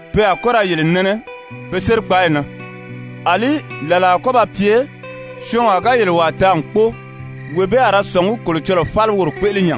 Pe a kɔ́ ra yele nɛnɛ be sérikpaayi na. Alí làlaa a kɔ́ ba pye syɔɔnwaa ga yele wàa taa n kpóo, wee bee a ra sɔ̀ngí Kolocɔlɔɔ fáli woro kpéʔele nya.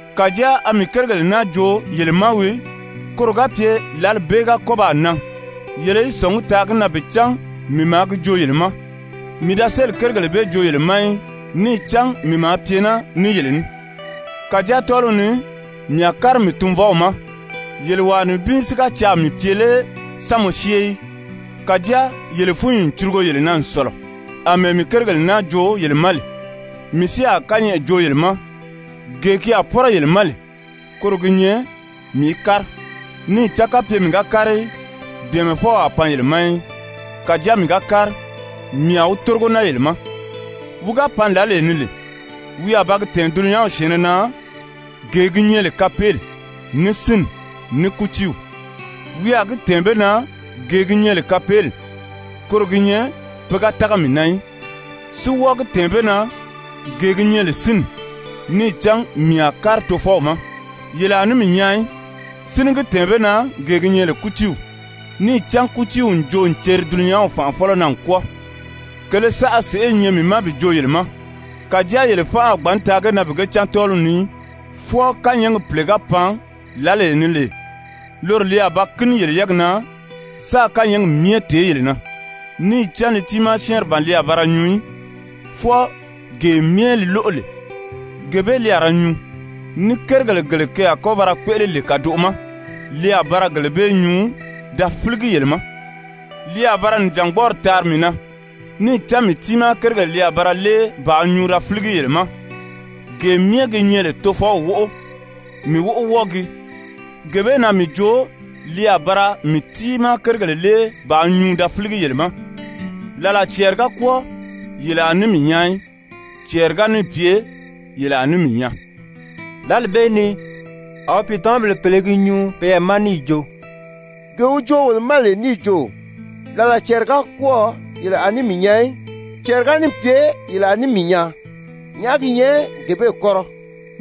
Kàjáa a mii kérigèle naa joo yele ma wii, koro ga pye lǎli bee ga kɔ́ baa nan yele í sɔ̀ngí taa gi na bi cán mii maa gi joo yele ma. Pìicǎnni fáli kéele «Mii da sélì kérigèle bee joo yele ma í, níì cán mii maa pye naa ní yele ní. Kàjáa tɔ́ɔliw ni mii a kári mii Tunvɔw ma, yele wàa nibin si ga caà mii pye lé, sán mɔ syée í? Kàjáa yele fúnyi n curugo yele na n sɔ̀lɔ, àmɛɛ mii kérigèle naa joo yele ma lè. Mii si a kányɛʔɛ joo yele ma, gee ki a pɔ́rɔ yele ma lè, koro gi nyɛ mii í kári, níì cán kapye mii ga kári í, Dɛ̀ɛmɛfɔw a pan yele ma í. Kàjáa mii ga kári, mii a wi tórigo naa yele ma. Wi ga pan lǎlee ni lè, wi a ba gi tɛ̀ɛn dulunyanw syɛ̀ɛnnɛ na gee gi nyɛ lè kapeeli, ní sínni, ní kútiiw. Wi a gi tɛ̀ɛn be na gee gi nyɛ lè kapeeli, koro gi nyɛ pe ga tága mii na í. Si wɔ́ɔ gi tɛ̀ɛn be na gee gi nyɛ lè sínni, níì cán mii a kári Tofɔw ma, yele a ní mii nyaa í. Si ní gi tɛ̀ɛn be na gee gi nyɛ lè kútiiw, níì cán kútiiw n joo n ceri dulunyanw fànʔafɔlɔ na n kwɔ́ɔ. Kèlē saʔa sèʔé i nyɛ mii ma bi joo yele ma, kàjáa yele fánʔa a gbǎn taa ge na bi ge cán tɔ́ɔliw ni í, fwɔɔ kányɛɛgi Pìle ga pan lǎlee ni lè, loro li a ba kíni yele yɛ́ɛgi na sáā kányɛɛgi myɛ tèé yele na. Níì cán li tiimaa syɛ́ɛnri ban li a ba ra nyuu í, fwɔɔ gee myɛ li lóʔo lè, gee bee li a ra nyuu, ní kérigèle gele ke a kɔ́ ba ra kpéʔele lè kàdoʔo ma, li a ba ra gele bee nyuu da fíligi yele ma. Li a ba ra nìjangbɔɔri taari mii na, níì cán mii tiimaa kérigèle li a ba ra lée bàā nyuu da fíligi yele ma. Gee myɛ gi nyɛ lè Tofɔw wóʔo, mii wóʔo wɔ́ɔ gii. Gee bee na mii jo li a ba ra mii tiimaa kérigèle lée bàā nyuu da fíligi yele ma. «Làlaa cɛɛri ga kwɔ́ɔ yele a ní mii nyaa í. Cɛɛri ga níì pye yele a ní mii nyaa.» Lǎli bee ni a wi pìitamabèle pèle i gi nyuu peyɛɛ ma níì jo: «Gee wi joo wolo ma lè níì jo: ‹Làlaa cɛɛri ga kwɔ́ɔ yele a ní mii nyaa í, cɛɛri ga níì pye yele a ní mii nyaa,› nyàʔá gi nyɛ gee bee kɔ́rɔ?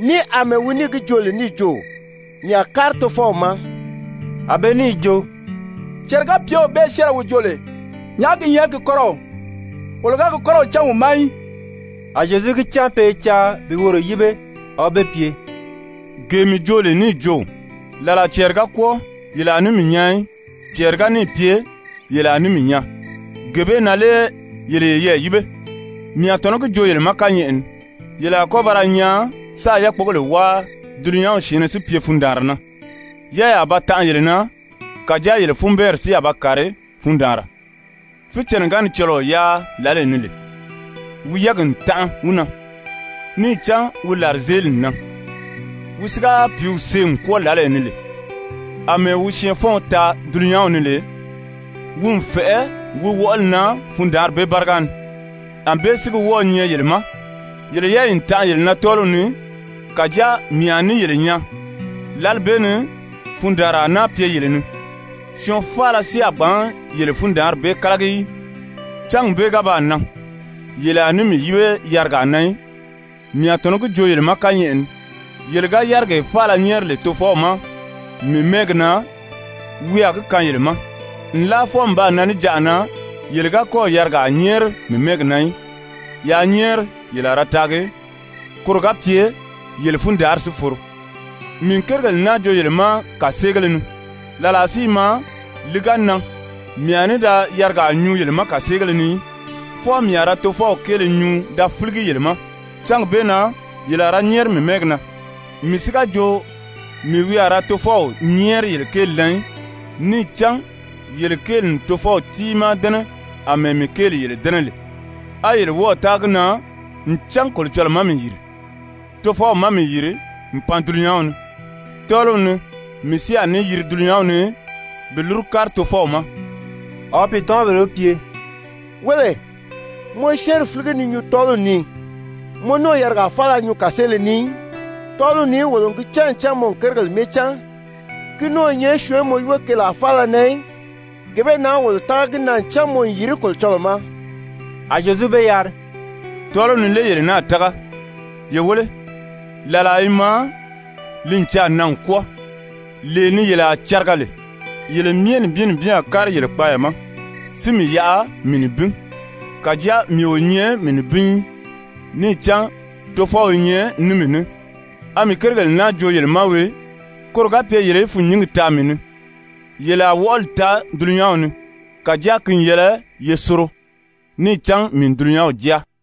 Ní àmɛɛ wi níì gi joo lè níì jo: ‹Mii a kári Tofɔw ma?›» A be níì jo: «Cɛɛri-ga-pyew bee syɛ́ɛnrɛ wi joo lè, nyàʔá gi nyɛ gi kɔ́rɔw? Wolo ga gi kɔ́rɔw cán wi ma í.» A Zyezu gi cán pe i caa bi woro yíbe, a wi be pye: «Gee mii joo lè níì jo: ‹Làlaa cɛɛri ga kwɔ́ɔ yele a ní mii nyaa í, cɛɛri ga níì pye yele a ní mii nyaa.› Gee bee na lé yele yeyɛɛ yíbe? Mii a tɔ̀nɔ́ gi joo yele ma kányɛʔɛ ni, yele a kɔ́ ba ra nyaan sáā yákpogèle wáa, dulunyanw syɛ̀ɛnnɛ si pye fundaanra na, yɛ́ɛyi a ba tanʔa yele na, kàjáa yele funbɛɛnri si a ba kàri fundaanra. Fícɛnnɛ ga ni cɔlɔɔ yáa lǎlee ni lè, wi yɛ́ɛgi n tanʔa wi na, níì cán wi làrizeeli n nan. Wi si ga pìíw see n kwɔ́ɔ lǎlee ni lè, àmɛɛ wi syɛɛnfɔ́ɔn taa dulunyanw ni lè, wi n fɛ̀ʔɛ wi wɔʔɔli na fundaanri bee báriga ni. Anbée si gi wɔ́ɔ̄ nyɛ yele ma, yele yɛ́ɛyi n tanʔa tɔ́ɔliw ni. Kàjáa mii a ní yele nyaa, lǎli bee ni fundaanra a náa pye yele ni, syɔɔn faala si a gbǎn yele fundaanri bee kálagi í. Cángi bee ga baa nan, yele a ní mii yíbe yarigaa na í. Mii a tɔ̀nɔ́ gi joo yele ma kányɛʔɛ ni, yele ga yárigee faala nyɛ́ɛri lè Tofɔw ma mii mɛ́ɛgi na, wi a gi kaan yele ma. Nlaa fwɔɔ n baa nan níjanʔa na, yele ga kɔ́ɔ̀ yarigaa nyɛ́ɛri mii mɛ́ɛgi na í. Yaa nyɛ́ɛri, yele a ra taagi koro ga pye yele fundaanri si foro. «Mii n kérigèle naa joo yele ma kàseegéle ni. Làlaa si i maa, li ga nan, mii a ní da yarigaa nyuu yele ma kàseegéle ni í, fwɔɔ mii a ra Tofɔw kéele nyuu da fíligi yele ma. Cángi bee na yele a ra nyɛ́ɛri mii mɛ́ɛgi na, mii si ga jo mii wi a ra Tofɔw nyɛ́ɛri yele kéeli na í. Níì cán yele kéeli n Tofɔw tiimaa dɛ́nɛ àmɛɛ mii kéeli yele dɛ́nɛ lè á yele wɔ́ɔ̀ tága gi na ncan Kolocɔlɔɔ má mii yìri. Tofɔw má mii yìri n pan dulunyanw ni. Tɔ́ɔliw ni mii si a ní yiri dulunyanw ni bi lúru kári Tofɔw ma.» A wi pìitamabèle wi pye: «Wéle, mɔ i syɛ́ɛnri fíligi ni nyuu tɔ́ɔliw ni. Mɔ ní o yarigaa faala nyuu kàseele ni í. Tɔ́ɔliw ni wolo n gi cán ncan mɔ n kérigèle myɛ cán, ki ní o nyɛ syɔɔn í mɔ yíbe keelaa faala na í. Gee bee na wolo tága gi na ncan mɔ n yìri Kolocɔlɔɔ ma.» A Zyezu be yari: «Tɔ́ɔliw ni lé yele náà tága? Ye wéle, làlaa i maa, li n caà nan n kwɔ́ɔ, lee ni yele a cariga lè, yele myɛ nibin nibin a kári yele kpaaya ma, si mii yaʔa mii nibin. Kàjáa mii o nyɛ mii nibin í, níì cán Tofɔw i nyɛ ní mii ní. A mii kérigèle naa joo yele ma wii, koro ga pye yele í fûnnyingi taa mii ni. Yele a wɔʔɔli taa dulunyanw ni. Kàjáa ki n yɛlɛ ye soro, níì cán mii n dulunyanw jáa.»